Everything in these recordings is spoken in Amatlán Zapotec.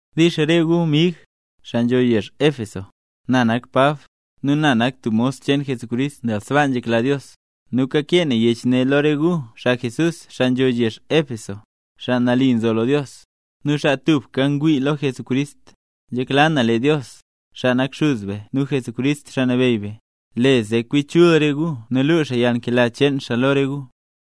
Dix re gu mig, xaa nzho yezh Éfeso. Na nak Pab, nu na nak tub mos cheen Jesucrist nel sbaa nzhekla Dios. Nu kakee na yech ne lo re gu xaa mle nambey Jesús, xaa nzho yezh Éfeso, xaa tubka ngwii lo Jesucrist. Nzhekla na lee Dios, xaa nak Xuz be nu Jesucrist, Xaa Nabeyy be, le zee kwi chul re gu nu luu xaa yalnkela cheen xaa lo re gu.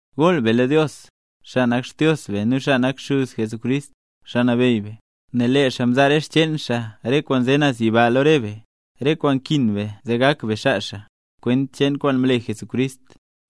Gool be lo Dios, xaa nak Xdios be nu xaa nak xuz Jesucrist, Xaa Nabeyy be, nel lee xaa mzaa re xcheen xaa re kwaan nze naz yiba lo re be, re kwaan nkin be zee gak be xaa xaa, kwent cheen kwaan mle Jesucrist.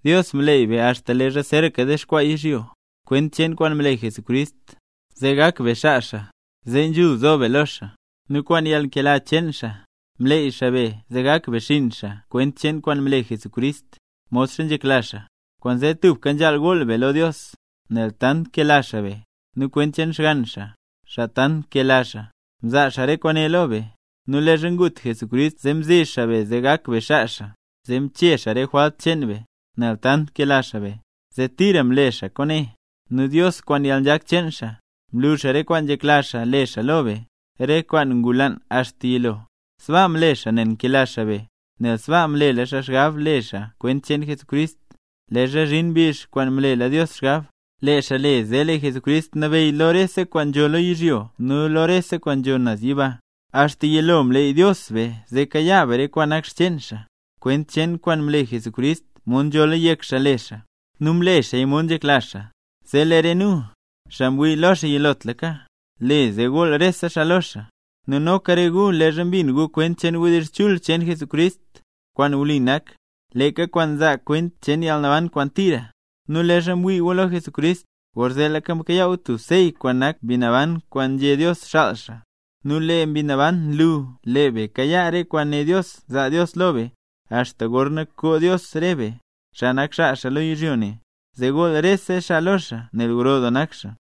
Dios mleey be axta leezha zeeraka dexkwaa yizhyo, kwent cheen kwaan mle Jesucrist, zee gak be xaa xaa zee nzhul zo be lo xaa. Nu kwaan yalnkela cheen xaa, mleey xaa be zee gak be xinn xaa kwent cheen kwaan mle Jesucrist, modxa nzhekla xaa. Kwaanzee tubka nzhaal gool be lo Dios, nel tant nkela xaa be; nu kwent cheen Xgann xaa, xaa tant nkela xaa, mzaa xaa re kwaane lo be. Nu leezha ngut Jesucrist zee mzi xaa be zee gak be xaa xaa, zee mchee xaa re jwalt cheen be, nel tant nkela xaa be, zee tira mle xaa kwaane. Nu Dios kwaan yalnzhak cheen xaa, mlu xaa re kwaan nzhekla xaa le xaa lo be, re kwaan ngulaan axta yilo. Sbaa mle xaa nel nkela xaa be, nel sbaa mlela xaa xgab le xaaya kwent cheen Jesucrist. Leezha zhin mbizh kwaan mlela Dios xgab, le xaa zee lee Jesucrist nabeyy rese kwaan nzho lo yizhyo nu rese kwaan nzho naz yiba. Axta yilo Dios mleeyla be zee kayaa be re kwaan nak xcheen xaa, kwent cheen kwaan mle Jesucrist mod nzhola yek xaa le xaa. Nu mle xaaya mod nzhekla xaa, zee lee re nu, xaa mwii lo xaa yilotlaka, le zee gool rese xaa lo xaa. Nu noka re gu leezha mbin gu kwent cheen wdizh chul cheen Jesucrist, kwaan wli nak, leeka kwaan nzaa kwent cheen yalnaban kwaan tira, nu leezha mwii gu lo Jesucrist, gorzeetlaka mkayaa gu tub sey kwaan nak Mbi Naban kwaan nzhé Dios xaal xaa. Nu lee Mbi Naban nlu lee be kayaa re kwaan né Dios zaa Dios lo be, axta gorna koo Dios re be, xaa nak xaa xaa lo yizhyo ne, zee gool rese xaa lo xaa nel gro doo nak xaa.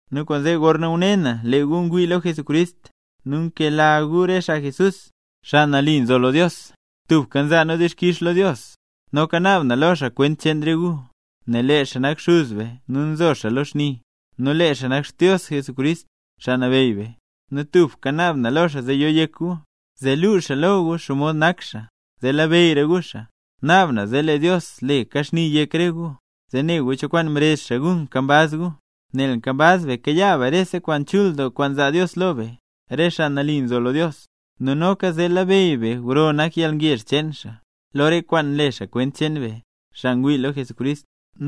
Nu kwaanzee, gorna ngune na lee gu ngwii lo Jesucrist, nu nkela gu re xaa Jesús, xaa nambey, tubka nza na dixkix lo Dios, noka naab na lo xaa kwent cheen re gu. Nel lee xaa nak Xuz be nu nzo xaa lo xni, nu lee xaa nak Xdios Jesucrist, Xaa Nabeyy be. Nu tubka naab na lo xaa zee yo yek gu, zee luu xaa lo gu xomod nak xaa, zee labeyyra gu xaa. Naab na zee lee Dios le kaxni yek re gu, zee ne gu cho kwaan mrezh xaa gu nkambaz gu. Nel nkambaz be kayaa be rese kwaan chul doo kwaan zaa Dios lo be, xaa nambey. Nu noka zee labeyy be gro doo nak yalngezh cheen xaa, lo re kwaan nle xaa kwent cheen be, xaa ngwii lo Jesucrist.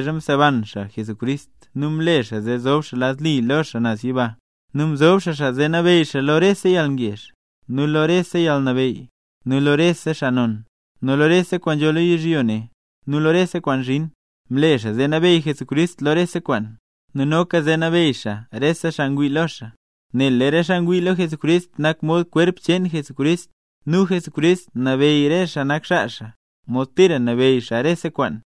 mseban xaa Jesucrist nu mle xaa zee zob xaa lad li lo xaa naz yiba. Nu mzob xaa xaa zee nabeyy xaa lo rese yalngezh, nu lo rese yalnabeyy, nu lo rese xaa non, nu lo rese kwaan nzho lo yizhyo ne nu lo rese kwaan zhin. Mle xaa zee nabeyy Jesucrist lo rese kwaan, nu noka zee nabeyy xaa re xaa ngwii lo xaa. Nel lee re xaa ngwii lo Jesucrist nak mod kwerp cheen Jesucrist, nu Jesucrist nabeyy re xaa nak xaa xaa, mod tira nabeyy xaa rese kwaan.